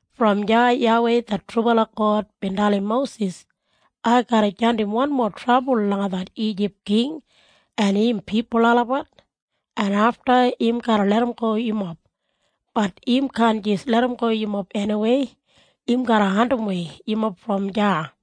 Brom deya YAWEI det trubala God bin dalim Mosis, “Ai garra jandim wanmo trabul langa det Ijip king en im pipul olabat, en afta im garra larramgo yumob. Bat im kaan jis larramgo yumob eniwei. Im garra andimwei yumob brom deya.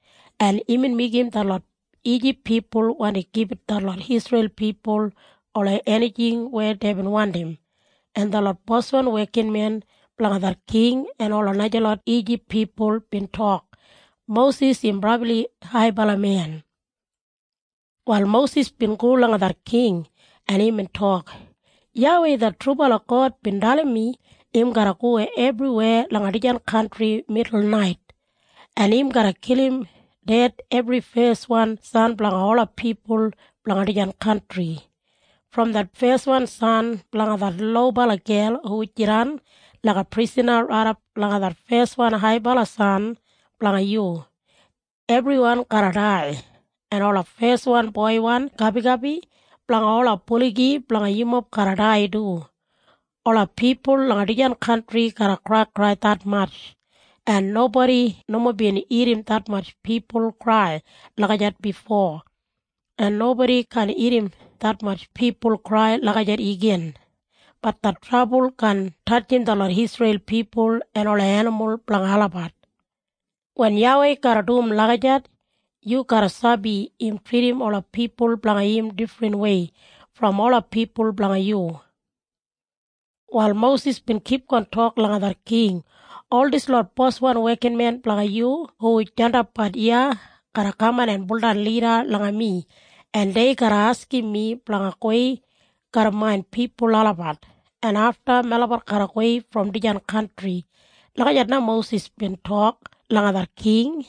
en imbin meigim detlot Ijip pipul wandi gibit detlot Isreil pipul ola enijing weya deibin wandim, en detlot boswan wekinmen blanga det king en ola najalot Ijip pipul bin tok, “Mosis im brabli haibala men.” Wal Mosis bin go langa det king, en imbin tok, “YAWEI det trubala God bin dalim mi im garra go ebriweya langa dijan kantri midulnait, en im garra kilim ded ebri feswan san blanga ola pipul blanga dijan kantri. Brom det feswan san blanga det lobala gel hu jidan laiga prisana raidap langa det feswan haibala san blanga yu, ebriwan garra dai. En ola feswan boiwan gabigabi blanga ola buligi blanga yumob garra dai du. Ola pipul langa dijan kantri garra kraikrai detmatj, en nobodi nomo bin irrim detmatj pipul krai lagijat bifo, en nobodi kaan irrim detmatj pipul krai lagijat igin. Bat det trabul kaan tatjim detlot Isreil pipul en ola enimul blanga olabat. Wen YAWEI garra dum lagijat, yu garra sabi im tridim ola pipul blanga im difrinwei brom ola pipul blanga yu.” Wal Mosis bin kipgon tok langa det king, “Ol dislot boswan wekinmen blanga yu hu jandapbat iya garra kaman en baudan lida langa mi, en dei garra askim mi blanga gowei garram main pipul olabat, en afta melabat garra gowei brom dijan kantri.” Lagijat na Mosis bin tok langa det king,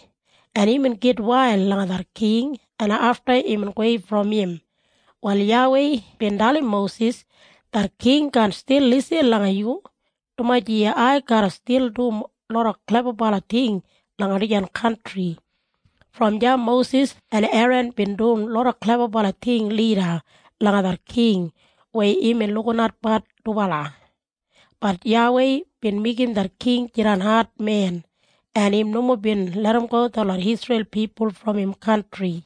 en imbin gitwail langa det king, en afta imbin gowei brom im. Wal YAWEI bin dalim Mosis, “Det king kaan stil lisin langa yu, dumaji ai garra stil dum loda klebabala ting langa dijan kantri.” Brom deya Mosis en Eran bin dum loda klebabala ting lida langa det king weya imbin lukinatbat dubala. Bat YAWEI bin meigim det king jidan admen, en im nomo bin larramgo detlot Isreil pipul brom im kantri.